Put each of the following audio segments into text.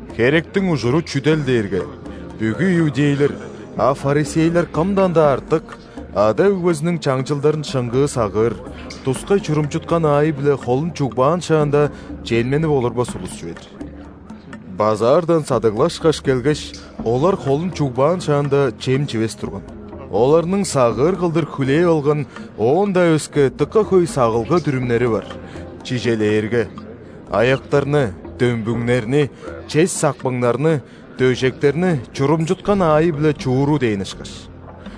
(Херектиң ужуру чүдел дээрге, бүгү иудейлер, а ·фарисейлер кымдан-даа артык, ада-өгбезиниң чаңчылдарын шыңгыы сагыыр, тускай чурумчуткан аайы-биле холун чугбаан шаанда, чемненип олурбас улус чүве-дир. Базаардан садыглашкаш келгеш, олар холун чугбаан шаанда, чем чивес турган. Оларның сагыыр кылдыр хүлээп алган оон-даа өске дыка хөй сагылга-дүрүмнери бар, чижээлээрге, аяктарны, дөмбүңнерни, чес сакпыңнарны, дөжектерни чурумчуткан аайы-биле чууру дээн ышкаш.)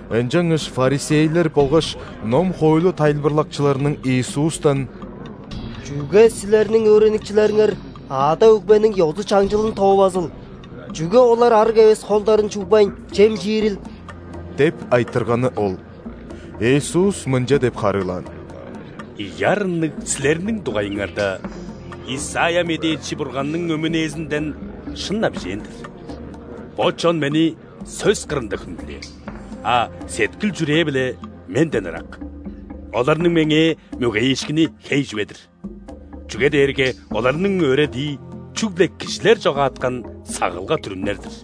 Ынчангаш фарисейлер болгаш ном-хоойлу тайылбырлакчыларының Иисустан: «Чүге Силерниң өөреникчилериңер ада-өгбениң ёзу-чаңчылын тоовазыл? Чүге олар ·арыг эвес холдарын чугбайн, чем чиирил?» – деп айтырганы ол. Иисус мынча деп харыылаан: «Ийи арынныг силерниң дугайыңарда Исайя медээчи Бурганның өмүнээзинден шын-на бижээн-дир:„Бо чон Мени сөс кырында хүндүлээр,а сеткил-чүрээ-биле Менден ырак. Оларның Меңээ мөгейиишкини хей чүве-дир,чүге дээрге оларның өөредии –чүгле кижилер чогааткан сагылга-дүрүмнер-дир“.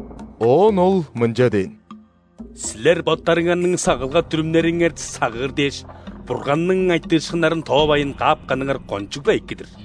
Оон Ол мынча дээн: «Силер боттарыңарның сагылга-дүрүмнериңер сагыыр дээш, Бурганның айтыышкыннарын тоовайн каапканыңар кончуг-ла эки-дир!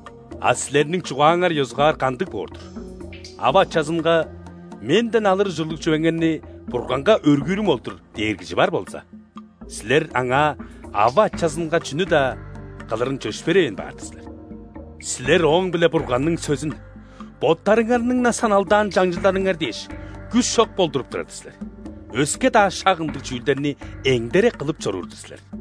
А силерниң чугааңар ёзугаар кандыг боор-дур? Ава-ачазынга: „Менден алыр ужурлуг чүвеңерни Бурганга өргүүрүм ол-дур“ – дээр кижи бар болза, силер аңаа ава-ачазынга чүнү-даа кылырын чөпшээревейн баар-дыр силер. Силер ооң-биле Бурганның сөзүн, боттарыңарның-на саналдаан чаңчылдарыңар дээш, күш чок болдуруп турар-дыр силер. Өске-даа шак ындыг чүүлдерни эңдере кылып чоруур-дур силер».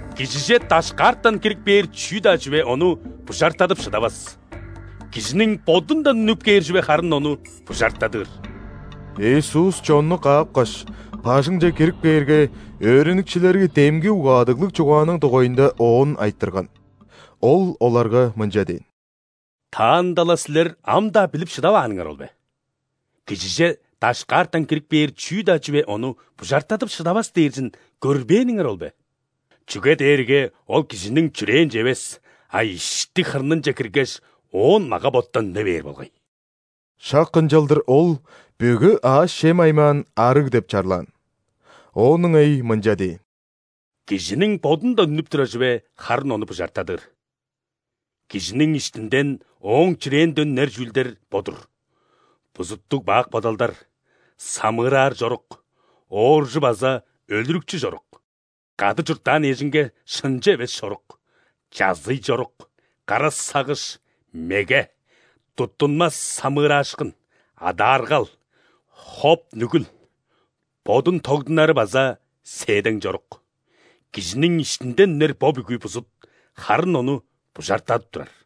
Кижиже дашкаартан кирип кээр чүү-даа чүве ону бужартадып шыдавас. Кижиниң бодундан үнүп кээр чүве харын ону бужартадыр». Иисус чонну каапкаш, бажыңче кирип кээрге, өөреникчилери демги угаадыглыг чугааның дугайында Оон айтырган. Ол оларга мынча дээн: «Таанда-ла силер ам-даа билип шыдавааныңар ол бе? Кижиже дашкаартан кирип кээр чүү-даа чүве ону бужартадып шыдавас дээрзин көрбээниңер ол бе? Чүге дээрге ол кижиниң чүрээнче эвес, а ишти-хырнынче киргеш, оон мага-боттан үне бээр болгай». (Шак ынчалдыр Ол бүгү аъш-чем аймаан ·арыг деп чарлаан.) Оон ыңай мынча дээн: «Кижиниң бодундан үнүп турар чүве харын ону бужартадыр. Кижиниң иштинден, ооң чүрээнден үнер чүүлдер бо-дур: бузуттуг-бак бодалдар, самыыраар чорук, ооржу база өлүрүкчү чорук, кады чурттаан эжинге шынчы эвес чорук, чазый чорук, кара сагыш, меге, туттунмас самыыраашкын, адааргал, хоп-нүгүл, бодун тогдунары база сээдең чорук. Кижиниң иштинден үнер бо бүгү бузут харын ону бужартадып турар».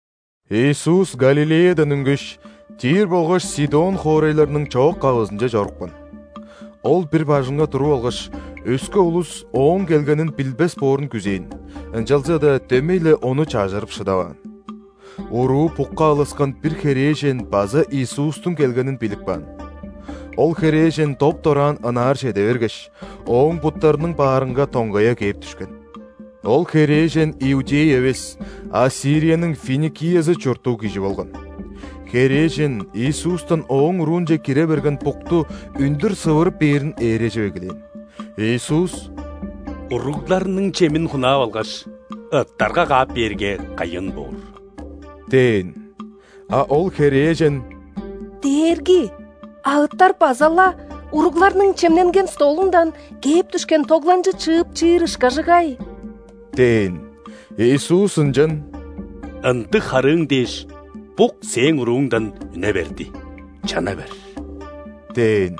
Иисус Галилеядан үнгеш, Тир болгаш Сидон хоорайларның чоок-кавызынче чорупкан. Ол бир бажыңга туруп алгаш, өске улус Ооң келгенин билбес боорун күзээн, ынчалза-даа дөмей-ле ону чажырып шыдаваан. Уруу букка алыскан бир херээжен база Иисустуң келгенин билип каан. Ол херээжен доп-дораан ынаар чеде бергеш, Ооң буттарының баарынга доңгая кээп дүшкен. Ол херээжен иудей эвес, а Сирияның Финикиязы чурттуг кижи болган. Херээжен Иисустан ооң уруунче кире берген букту үндүр сывырып бээрин ээрежип эгелээн. Иисус: «Уругларның чемин хунаап алгаш, ыттарга каап бээрге, кайын боор» – дээн. А ол херээжен: «Дээрги, а ыттар база-ла уругларның чемненген столундан кээп дүшкен тогланчы чыып чиир ышкажыгай» – дээн. Иисус ынчан: «Ындыг харыың дээш, бук сээң урууңдан үне берди, чана бер» – дээн.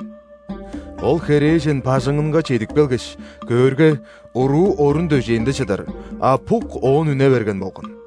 Ол херээжен бажыңынга чедип келгеш, көөрге, уруу орун-дөжээнде чыдар, а бук оон үне берген болган.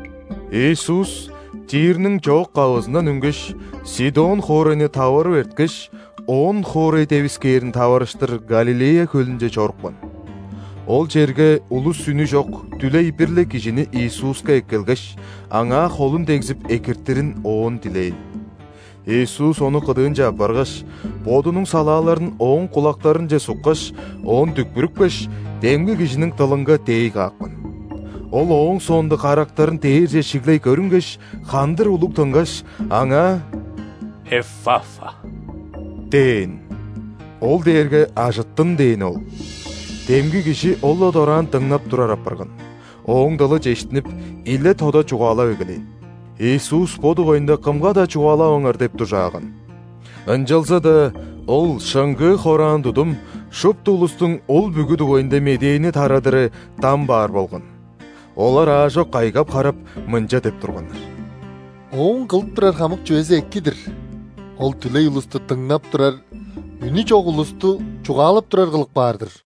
Иисус Тирниң чоок-кавызындан үнгеш, Сидон хоорайны таварып эрткеш, ·Он-хоорай девискээрин таварыштыр Галилея хөлүнче чорупкан. Ол черге улус үнү чок, дүлей бир-ле кижини Иисуска эккелгеш, аңаа холун дегзип, экиртирин Оон дилээн. Иисус ону кыдыынче аппаргаш, Бодунуң салааларын ооң кулактарынче суккаш, оон дүкпүрүпкеш, демги кижиниң дылынга дээй каапкан. Ол ооң соонда карактарын дээрже шиглей көрүнгеш, хандыр улуг тынгаш, аңаа: «Эффафа!» – дээн. (Ол дээрге «Ажыттын!» дээни ол.) Демги кижи ол-ла дораан дыңнап турар апарган, ооң дылы чештинип, иле-тода чугаалап эгелээн. Иисус бо дугайында кымга-даа чугаалаваңар деп дужааган. Ынчалза-даа Ол шыңгыы хораан тудум, шупту улустуң ол бүгү дугайында медээни тарадыры дам баар болган. Олар аажок кайгап-харап, мынча деп турганнар: «Ооң кылып турар хамык чүвези эки-дир. Ол дүлей улусту – дыңнап турар, үнү чок улусту – чугаалап турар кылып каар-дыр!»